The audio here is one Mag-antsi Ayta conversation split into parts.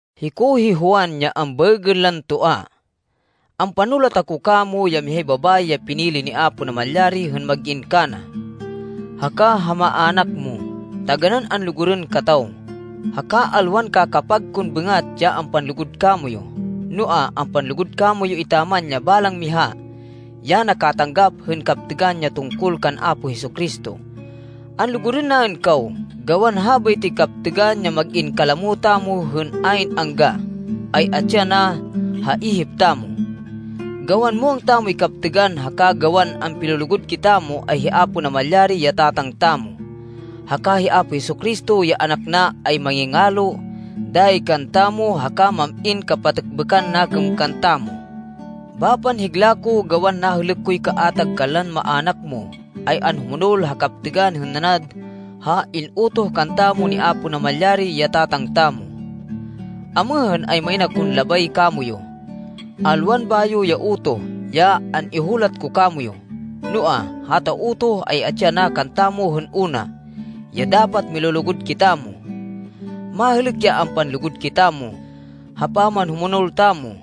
Hiko hi Juan, ya ambaêgên lan Toa. Ampanulat ako kamo, ya mihay babayi ya pinili ni Apo Namalyari hên mag-in kana, haka ha maának mo. Taganán anlugurên kataw, haka alwan kakapag kon bêngat ya ampanlugud kamoyu, noa, ampanlugud kamoyu etaman ya balang miha ya nakatanggap hên kaptêgan ya tungkol kan Apo Jesu-Cristo. Anlugurên naên kaw, gawan habaytoy kaptêgan, ya mag-in kalamo tamo hên ayn angga, ay atsi yana ha ihip tamo. Gawan muwang tamoy kaptêgan haka gawan ampilulugud kitamo, ay hi Apo Namalyari, ya Tatang tamo, haka hi Apo Jesu-Cristo ya Anak na, ay mangingalo dayi kantamo, haka mam-in kapatêkbêkan nakêm kantamo. Bapan higla ko, gawan nahêlêk koy kaatag kanlan maának mo, ay anhumonol ha kaptêgan hên nanad ha in-utoh kantamo ni Apo Namalyari, ya Tatang tamo. Amêhên, ay main akon labay kamoyu. Alwan bayo ya utoh ya an-ihulat ko kamoyu. Noa, hata utoh ay atsi yana kantamo hên una, ya dapat milulugud kitamo. Mahêlêk ya ampanlugud kitamo, ha pamanhumonol tamo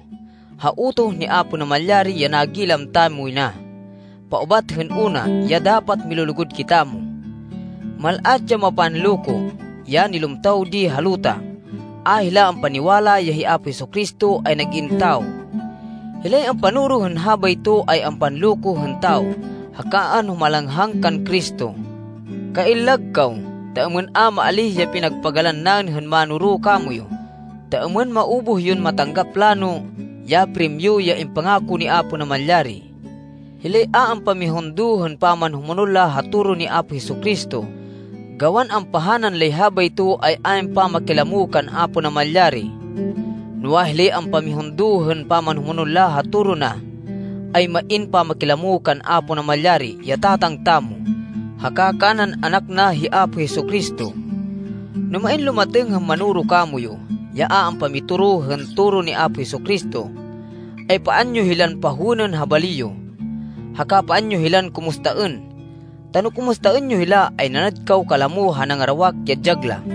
ha utoh ni Apo Namalyari, ya nagilam tamoy na, paubat hên una, ya dapat milulugud kitamo. Mal-at ya mapanloko, ya nilumtaw di ha luta. A hila ampaniwala ya hi Apo Jesu-Cristo ay nag-in tawo. Hilay ampanoro hên habayto ay ampanloko hên tawo haka anhumalanghang kan Cristo. Kaillag kaw, ta êmên a maalíh ya pinagpagalan naên hên manoro kamoyu, ta êmên maubuh yon matanggap lano ya primyo ya impangako ni Apo Namalyari. Hilay a ampamihundo hên pamanhumonol la ha toro ni Apo Jesu-Cristo, gawan ampahanan lay habayto, ay ayn pamakilamo kan Apo Namalyari. Noa, hilay ampamihundo hên pamanhumonol la ha toro na, ay main pamakilamo kan Apo Namalyari, ya Tatang tamo, haka kanan Anak na, hi Apo Jesu-Cristo. No main lumatêng hên manoro kamoyu, ya a ampamitoro hên toro ni Apo Jesu-Cristo, ay paan yo hilan pahowênên ha bali yo, haka paan yo hilan kumustaên. Ta no kumustaên yo hila, ay nanad kaw kalamo ha nangarawak ya dyag la.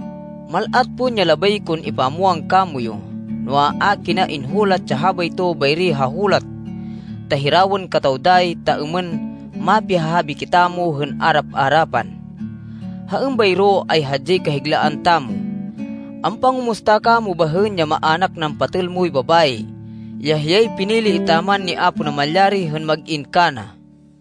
Mal-at pon ya labay kon ipamwang kamoyu, noa, a kina inhulat ya habayto bayri ha hulat ta hirawên kataw dayi, ta êmên mapihahabi kitamo hên arap-arapan. Ha êmbayro, ay hadyay kahiglaan tamo. Ampangumusta kamo bahên ya maának nan patêl moy babayi, ya hiyay pinili etaman ni Apo Namalyari hên mag-in kana.